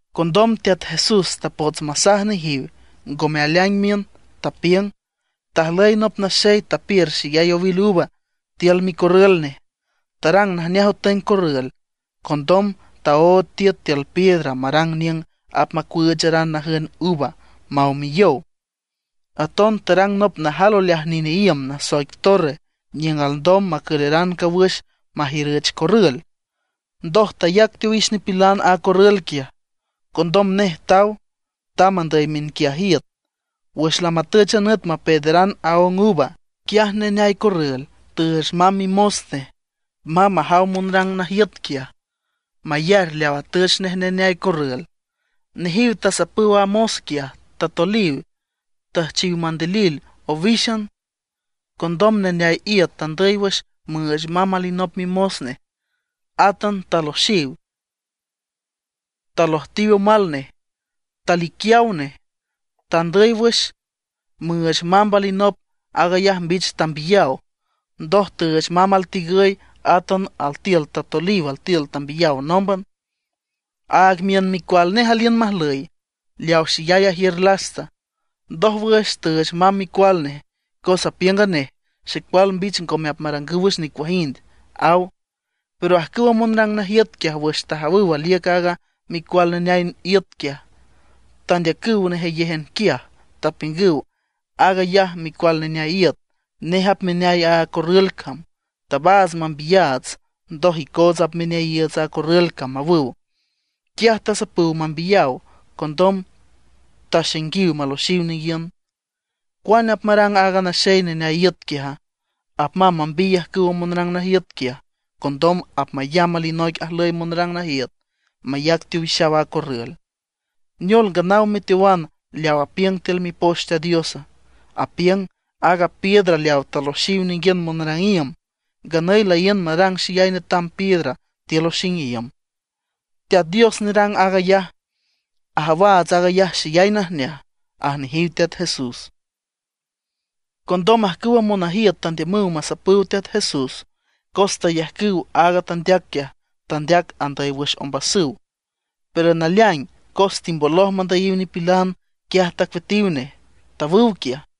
Condom Teat Jesús tapots masaj nejiw, ngome aleaing miün. Tapiüng: ―Tajlüy nop naxey tapiür xeyay owil uva tiül micorrül nej. Tarang najneaj otüeng corrül. Condom taood tiüt tiül piedra marang niüng apmacuüücharan najün uva maw miyow. Aton tarang nop najal oleaj nine iüm nasoic torre niüng alndom macüleran cawüx majiürüch corrül. Ndoj tayac teowix nipilan a corrül quiaj. Condom nej taw, tamb andüy miünquiaj iüt. Wüx lamatüch a nüt mapeederan aóng uva, quiaj neneay corrül tüüch mamb mimos nej mamb majaw monrang najiüt quiaj, mayar leaw atüch nej neneay corrül. Nejiw tasapüw a mos quiaj, tatoliw, tüjchiw mandilil owíxan. Condom neneay iüt tandüy wüx müüch mamb alinop mimos nej. Átan taloxiw, talojtiw omal nej, taliquiaw nej. Tandüy wüx müüch mamb alinop, aag ayaj mbich tambiyaw. Ndoj tüüch mamb altigüy, átan altiül tatoliw, altiül tambiyaw nómban. ’Aag miün micual nej aliün majlüy, leaw xeyay ajiür lasta. Ndójwüx tüüch mamb micual nej. Cos apiüng a nej: “Xecual mbich ngome apmarangüw wüx nicuajind”, aw. Pero ajcüwa monrang najiüt quiaj wüx tajawüw aliüc aaga micual neneay iüt quiaj, tandeacüw nejeyéjan quiaj, tapiüngüw: “Aag ayaj micual neneay iüt, nej apmeneay a corrül cam. Tabaats mambiyaats, ndoj icoots apmaneayiiüts a corrül cam”, awüw. Quiaj tasapüw mambiyaw. Condom taxainguiw maloxiw ninguiün. ’¿Cuane apmarang aaga naxey neneay iüt quiaja? Apmamb mambiy ajcüwa monrang najiüt quiaj. Condom apmayamb alinoic ajlüy monrang najiüt, mayac teowixaw aaga corrül. ’¿Neol, nganaw meteowan leaw apiüng tiül Mipoch Teat Dios? Apiüng: Aaga piedra leaw taloxiw ninguiün monrang iüm, nganüy laíün marang xeyay netam piedra tiül oxing iüm. Teat Dios nerang aag ayaj, ajawaats aag ayaj xeyay najneaj ―aj nejiw Teat Jesús. Condom ajcüwa monajiüt tandiümüw masapüw Teat Jesús, cos tayajcüw aaga tandeac quiaj tandeac andüy wüx ombasüw. Pero naleaing cos timboloj mandüyiw nipilan, quiaj tacueatiw nej, tawüw quiaj.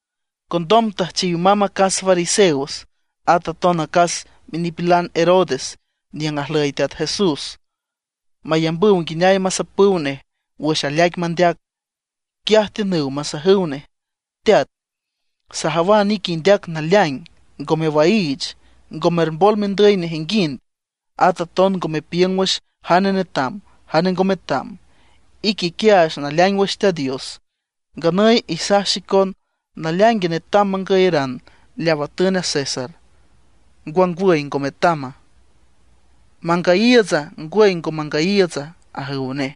Condom tüjchiw mamb acas fariseos at aton acas minipilan Herodes niüng ajlüy Teat Jesús, mayambüw nguineay masapüw nej wüx aleaic mandeac. Quiaj tiünüw masajüw nej: ―Teat, sajawan ique indeac naleaing, ngo mewaiich, ngo mermbol mendüy nejinguind. At aton ngo mepiüng wüx jane netam, jane ngo metam. Ique iquiaach naleaing wüx Teat Dios. Nganüy isaj xicon, ¿naleaingue netam mangüyaran leaw atün a César, ngwangwüy ngo metama? ¿Mangüyiiütsa, ngwüy ngo mangüyiiütsa? ―ajüw nej.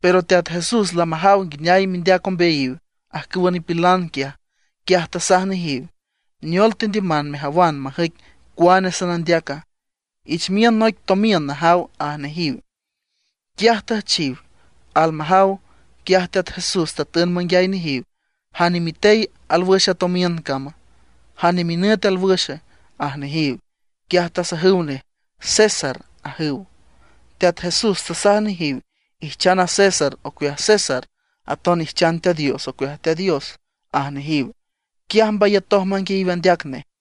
Pero Teat Jesús lamajaw nguineay mindeac ombeayiw ajcüwa nipilan quiaj, quiaj tasaj nejiw: ―¿Neol tendiüman mejawan majüic cuane sanandeaca? Ich miün noic tomiün najaw ―aj nejiw. Quiaj tüjchiw. Almajaw, quiaj Teat Jesús tatün manguiay nejiw: ―¿Jane mitey alwüx a tomiün cama, jane minüt alwüxe? ―aj nejiw. Quiaj tasajüw nej: ―César ―ajüw. Teat Jesús tasaj nejiw: ―Ijchan a César ocueaj César, aton ijchan Teat Dios ocueaj Teat Dios ―aj nejiw. Quiaj mbayatoj manguiayiw andeac nej.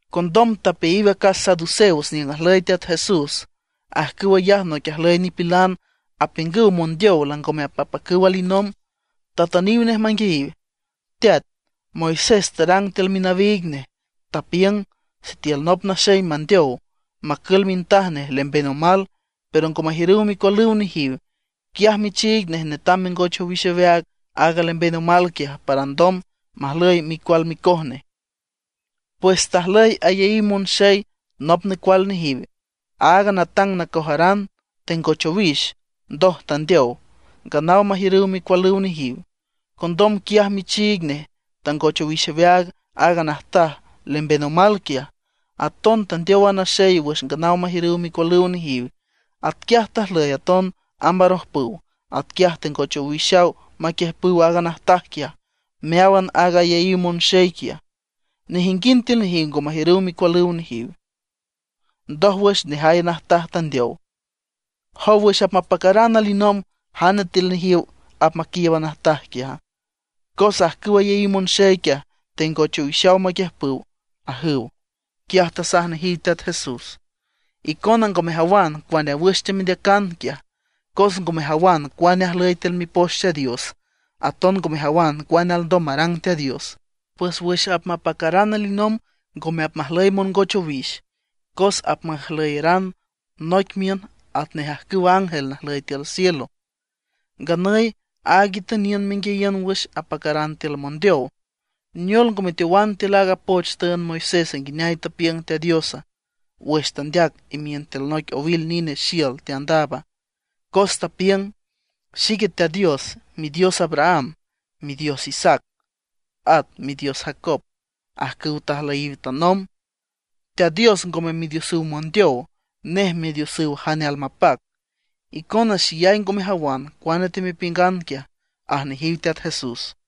Condom tapeayiw acas saduceos niüng ajlüy Teat Jesús. Ajcüw ayaj noic ajlüy nipilan apiüngüw mondeow langome apmapacüw alinomb. Tatüniw nej manguiayiw: ―Teat, Moisés tarang tiül minawiig nej, tapiüng sitiül nop naxey mandeow, macül mintaj nej lemben omal, pero ngo majiürüw micualüw nejiw, quiaj michiig nej netam mengoch owix aweaag aaga lemben omal quiaj, para alndom majlüy micual micoj nej. Pues tajlüy ayaíw monxey nop necual nejiw. Aaga natang nacojaran tengoch owix, ndoj tandeow, nganaw majiürüw micualüw nejiw. Condom quiaj michiig nej tangoch owix aweaag aaga najtaj lemben omal quiaj. Aton tandeow a naxey wüx nganaw majiürüw micualüw nejiw. Atquiaj tajlüy aton amb arojpüw. Atquiaj tengoch owixaw maquiüjpüw aaga najtaj quiaj meáwan aaga ayaíw monxey quiaj. Nejinguind tiül nejiw ngo majiürüw micualüw nejiw. Ndójwüx nejay a najtaj tandeow. ¿Jow wüx apmapacaran alinomb, jane tiül nejiw apmaquiiüb a najtaj quiaja? Cos ajcüwa ayaíw monxey quiaj tengoch owixaw maquiüjpüw ―ajüw. Quiaj tasaj nejiw Teat Jesús: ―Icona ngo mejawan cuane wüx teamendeacan quiaj, cos ngo mejawan cuane ajlüy tiül Mipoch Teat Dios. Aton ngo mejawan cuane alndom marang Teat Dios. Pues wüx apmapacaran alinomb ngome apmajlüy mongoch owix, cos apmajlüyaran noic miün atnej ajcüw ángel najlüy tiül cielo. Nganüy aaga itüniün menguiayiün wüx apacaran tiül mondeow, ¿neol ngo meteowan tiül aaga poch tüünd Moisés nguineay tapiüng Teat Dios wüx tandeac imiün tiül noic owil nine xiül teandaab? Cos tapiüng: “Xique Teat Dios, Midios Abraham, Midios Isaac, at Midios Jacob, ajcüw tajlüyiw tanomb”. Teat Dios ngome Midiosüw mondeow, nej Midiosüw jane almapac. Icona xeyay ngo mejawan cuane teamepiüngan ―aj nejiw Teat Jesús.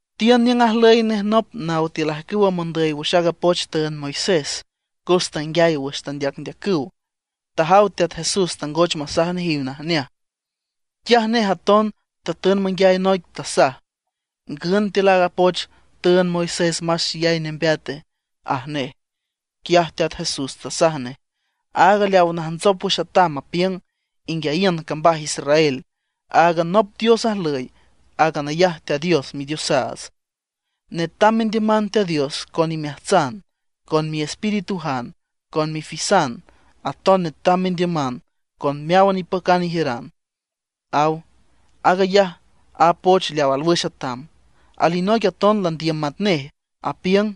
Tiün niüng ajlüy nej nop naw tiül ajcüwa mondüy wüx aaga poch tüünd Moisés cos tanguiay wüx teandeacndeacüw. Tajaw Teat Jesús tangoch masaj nejiw najneaj. Quiaj nej aton tatün manguiay noic, tasaj: ―¿Ngün tiül aaga poch tüünd Moisés más xeyay nembeate? ―aj nej. Quiaj Teat Jesús tasaj nej: ―Aaga leaw najntsop wüx atam apiüng: “Inguiayiün cambaj Israel, áagan nop Dios ajlüy aag ayaj Teat Dios Midiosaats. Netam mendiüman Teat Dios con imeajtsan, con miespiritujan, con mifisan; aton netam mendiüman con meáwan ipacan ijiüran”, aw. Aag ayaj a poch leaw alwüx atam. Alinoic aton landiüm matnej, apiüng: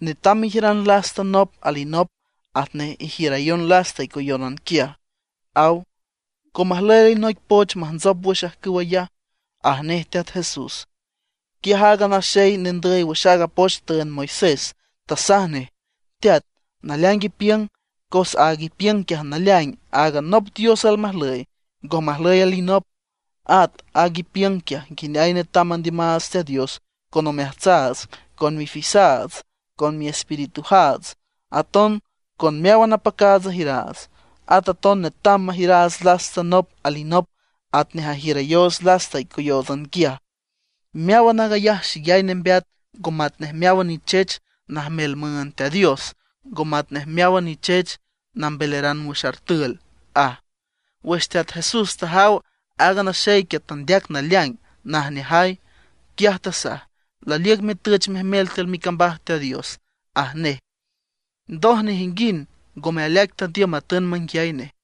“Netam mejiüran lasta nop alinop atnej ijiürayon lasta icoyónan quiaj”, aw. Ngo majlüy alinoic poch majntsop wüx ajcüw ayaj ―aj nej Teat Jesús. Quiaj aaga naxey nendüy wüx aaga poch tüünd Moisés tasaj nej: ―Teat, naleaing ipiüng. Cos aag ipiüng quiaj naleaing áagan nop Dios almajlüy, ngo majlüy alinop. At aag ipiüng quiaj nguineay netam mandiümaats Teat Dios con omeajtsaats, con mifisaats, con miespiritujaats, aton con meáwan apacaats ajiüraats. At aton netam majiüraats lasta nop alinop atnej ajiürayoots lasta icoyóotsan quiaj. Meáwan aag ayaj xeyay nembeat ngo matnej meáwan nichech najmel müünd Teat Dios, ngo matnej meáwan nichech nambelaran wüx artül ―aj. Wüx Teat Jesús tajaw aaga naxey tandeac naleaing najneajay, quiaj tasaj: ―Laliüc metüch mejmel tiül micambaj Teat Dios ―aj nej. Ndoj nejinguind ngome aleaic tandiüm matün manguiay nej.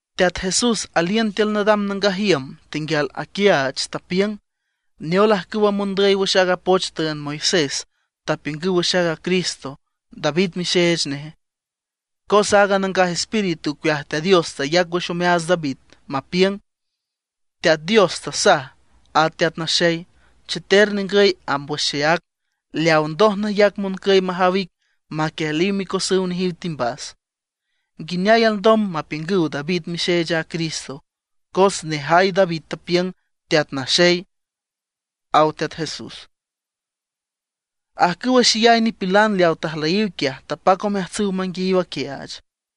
Teat Jesús aliün tiül nadam nangaj iüm, tenguial aquiaach, tapiüng: ―¿Neol ajcüwa mondüy wüx aaga poch tüünd Moisés tapiüngüw wüx aaga Cristo, David mixeech neje? Cos aaga Nangaj Espíritu ocueaj Teat Dios tayac wüx omeaats David mapiüng: Teat Dios tasaj a Teat Naxey: “Cheter ningüy amb wüx xeác leaw ndoj nayac moncüy majaw ic maquiejliw micosüw nejiw timbas.” ¿Nguineay alndom mapiüngüw David mixeech aaga Cristo? Cos nejay David tapiüng “Teat Naxey” ―aw Teat Jesús. Ajcüwa xeyay nipilan leaw tajlüyiw quiaj, tapac omeajtsüw manguiayiw aquiaach.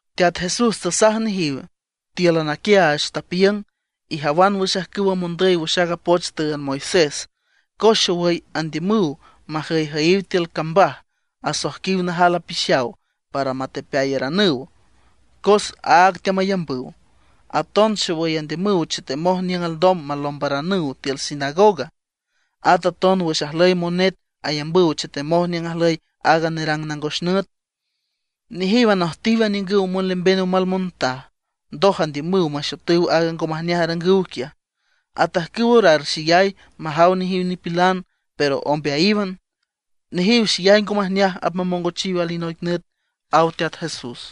Teat Jesús tasaj nejiw tíülan aquiaach, tapiüng: ―Ijawan wüx ajcüwa mondüy wüx aaga poch tüünd Moisés, cos xowüy andiümüw majüyjüyiw tiül cambaj asoijquiw najal apixaw para matepeayaranüw cos áag teamayambüw. Aton xowüy andiümüw chetemoj niüng alndom malombaranüw tiül sinagoga. At aton wüx ajlüy monet ayambüw chetemoj niüng ajlüy aaga nerang nangos nüt. Nejiw anojtiw aniüngüw monlemben omal montaj, ndoj andiümüw maxotüw aaga ngo majneaj arangüw quiaj, atajcüw orar xeyay majaw nejiw nipilan, pero ombeayíwan. Nejiw xeyay ngo majneaj apmamongochiw alinoic nüt ―aw Teat Jesús.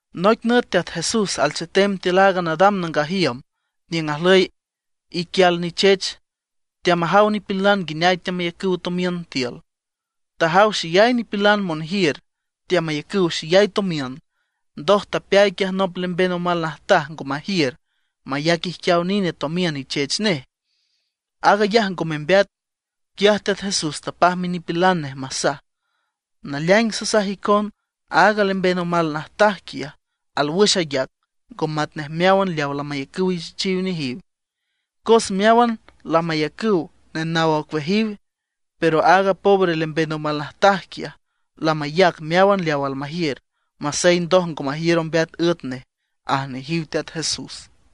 Noic nüt Teat Jesús alchetem tiül aaga nadam nangaj iüm niüng ajlüy iquial nichech, teamajaw nipilan nguineay teamayacüw tomiün tiül. Tajaw xeyay nipilan monjiür, teamayacüw xeyay tomiün. Ndoj tapeay quiaj nop lemben omal najtaj ngo majiür, mayac ijquiaw nine tomiün ichech nej, aag ayaj ngo membeat. Quiaj Teat Jesús tapaj minipilan nej masaj: ―Naleaing sasaj icon aaga lemben omal najtaj quiaj alwüx ayac, ngo matnej meáwan leaw lamayacüw ichechiw nejiw. Cos meáwan lamayacüw nenaw ocueajiw, pero aaga pobre lemben omal najtaj quiaj, lamayac meáwan leaw almajiür, masey ndoj ngo majiür ombeat üet nej ―aj nejiw Teat Jesús.